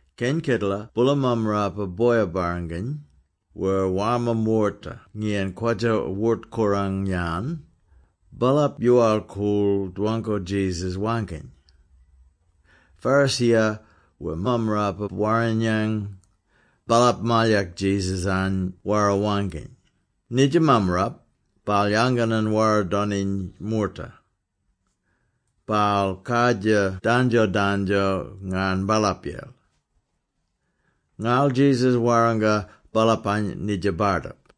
Keny kedela boola mammarapa boya-barranginy, wer warma moorta ngiyan kwadja wort-korang-yan, baalap yoowal-koorl dwangko Jesus waangkiny, Pharisee-ya wer Mammarapa-Warrinyang, baalap malyak Jesus-any wara-waangkiny, “Nidja mammarap, baal yanganan wara-doniny moorta. Baal kardjir dandjo-dandjo ngarn baalapyel!” Ngarl Jesus warranga baalapany nidja bardip: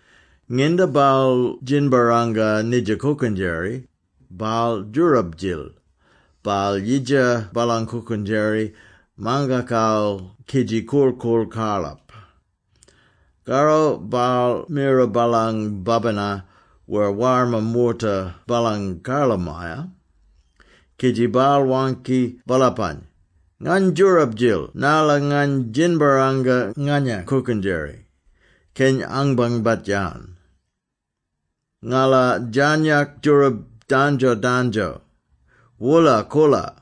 Nginda baal djinbarranga nidja kookendjeri, baal djoorab-djil, baal yidja baalang kookendjeri mangakal kidji korl-koorl karlap. Karro baal mira baalang babina wer warma moorta baalang karlamaya, kidji baal waangki baalapany, ‘Ngany djoorab-djil narla ngany djinbarranga nganyang kookendjeri, keny angbangbat-yan. Ngala djarnyak djoorab dandjo-dandjo. Woola-koola!’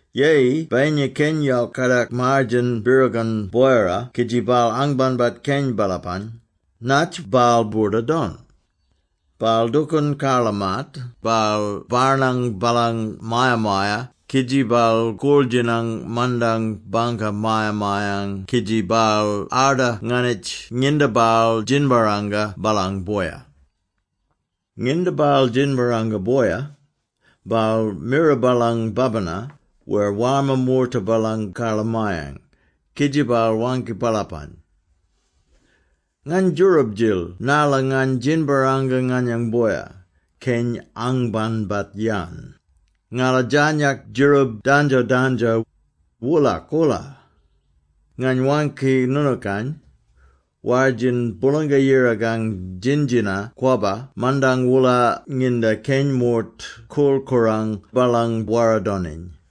“Yeyi bayinya keny yok kadak maar-djen birrigon boyara kidji baal anbangbat keny baalapang, natj baal boorda-don? Baal dookoon karla-maat, baal barnang baalang maya-maya kidji baal koorl-djinang mandang bangka maya-mayang kidji baal arda nganitj nginda baal djinbarranga baalang boya. Nginda baal djinbarranga boya, baal mira baalang babina, wer warma moorta baalang karlamayang, kidji baal waangki baalapany, ‘Ngany djoorab-djil narla ngany djinbarranga nganyang boya, keny angbangbat-yan. Ngala djarnyak djeroob dandjo-dandjo. Woola-koola!’ Ngany waangki noonookany, war-djin, Boolanga-Yirakang djin-djina-kwabba mandang woola nginda keny moort korl-korang baalang wara-doniny.”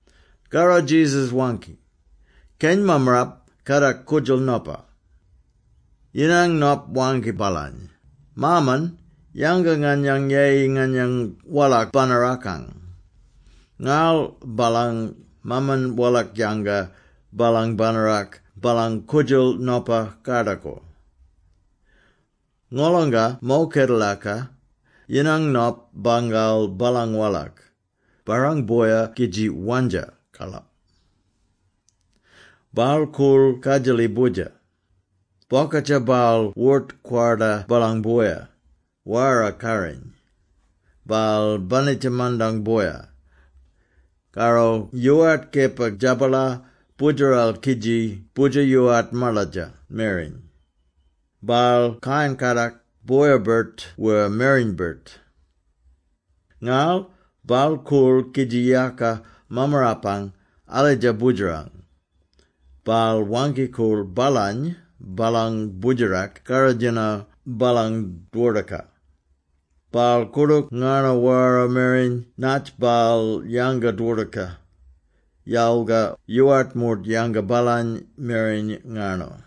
Karro Jesus waangki, “Keny mammarap kadak koodjal nopa. Yinang nop waangki baalany, ‘Maaman, yanga nganyang yeyi nganyang walak banarakang!’ Ngarl baalang maaman walak-yanga baalang banarak baalang koodjal nopa kardakor. Ngolonga mo kedelaka, yinang nop bangal baalang walak, barrang boya kidji wandja karlap. Baal koorl kadjali boodjer. Bokadja baal wort-kwarda baalang boya, wara karriny. Baal banitja mandang boya. Karro yoowart kepa djabalar boodjeral kidji boodjer yoowart maladja mereny. Baal kayan-kadak, boya-birt wer mereny-birt. Ngarl baal koorl kidji yaka mammarapang alidja boodjerang. Baal waangki-koorl baalany baalang boodjerak karrodjino baalang dwordoka. Baal koordook ngarno wara mereny natj baal yanga dwordoka, yalga yoowart moort yanga baalany mereny ngarno.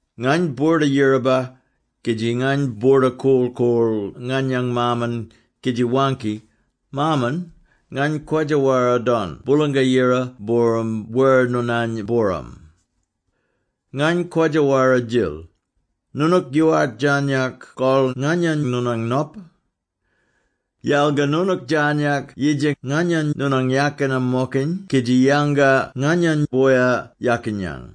Ngany boorda-yiraba kidji ngany boorda korl-koorl nganyang maaman kidji waangki, “Maaman, ngany kwadja-wara-don Boolanga-Yira booram wer noonany booram. Ngany kwadja-wara-djil. Noonook yoowart djarnyak kol nganyany noonang nop. Yalga noonook djarnyak yidja nganyany noonang yakina-mokiny kidji yanga nganyany boya yakinyang.” ’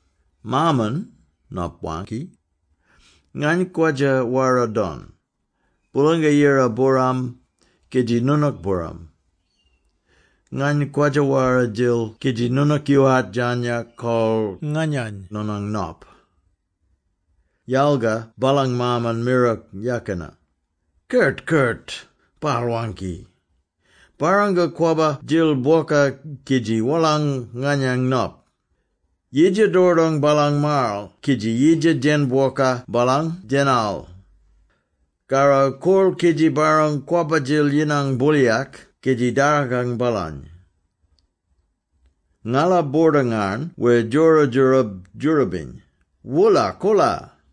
‘Maaman,’ nop waangki, ‘Ngany kwadja-wara-don, Boolanga-Yira booram, kidji noonook booram. Ngany kwadja-wara-djil kidji noonook yoowart djarnyak kol nganyany noonang nop.’ Yalga baalang maaman mira yakina. ‘Kert-kert!’ baal waangki. ‘Barranga kwabba-dil bwoka kidji wolang nganyang nop. Yidja dordong baalang maaral kidji yidja djena-bwoka baalang djenal. Karro koorl kidji barrang kwabba-djil yinang booliyak kidji dargang baalany. Ngala boorda-ngarn wer djora djoorab-djoorabiny. Woola-koola!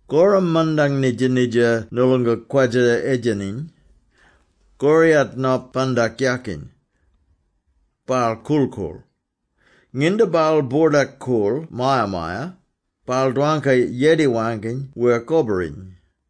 “Korram mandang nidja-nidja noolonga kwadja-edjeniny, koriyat nop bandak yakiny. Baal korl-koorl. Nginda baal boordak-koorl maya-maya, baal dwangka yedi-waangkiny wer koboriny,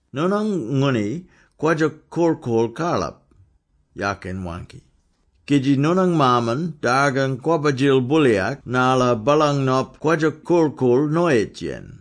‘Noonang ngooni kwadja-korl-koorl karlap,’ yakin waangki, ‘kidji noonang maaman dargang kwabba-djil booliyak narla baalang nop kwadja korl-koorl noyitj-yen.’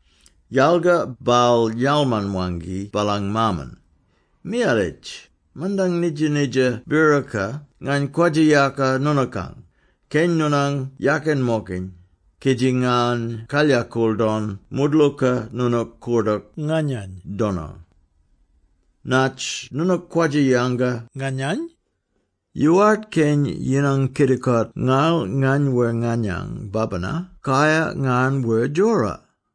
“Yalga baal yalman-waangki baalang maaman, ‘Miyalitj, mandang nidja-nidja biroka ngany kwadja-yaka noonookang, keny noonang yakin-mokiny, kidji ngany kalyakool don moodlooka noonook koordook nganyany dono. Natj noonook kwadja-yanga nganyany? Yoowart keny yinang kidikot ngarl ngany wer nganyang babina kayar ngarn wer djora!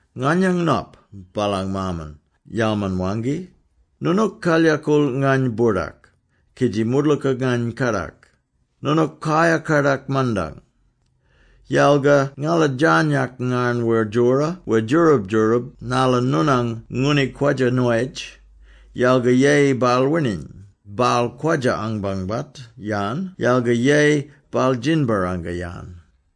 “ ‘Nganyang nop,’ baalang maaman yalman-waangki, ‘Noonook kalykool ngany-boordak, kidji moodloooka ngany kadak, noonook kayar-kadak mandang. Yalga ngala djarnyak ngarn wer djora wer djoorab-djoorab narla noonang ngooni kwadja-noyitj yalga yeyi baal wining; baal kwadja-anbangbat-yan yalga yeyi baal djinbarranga-yan.’”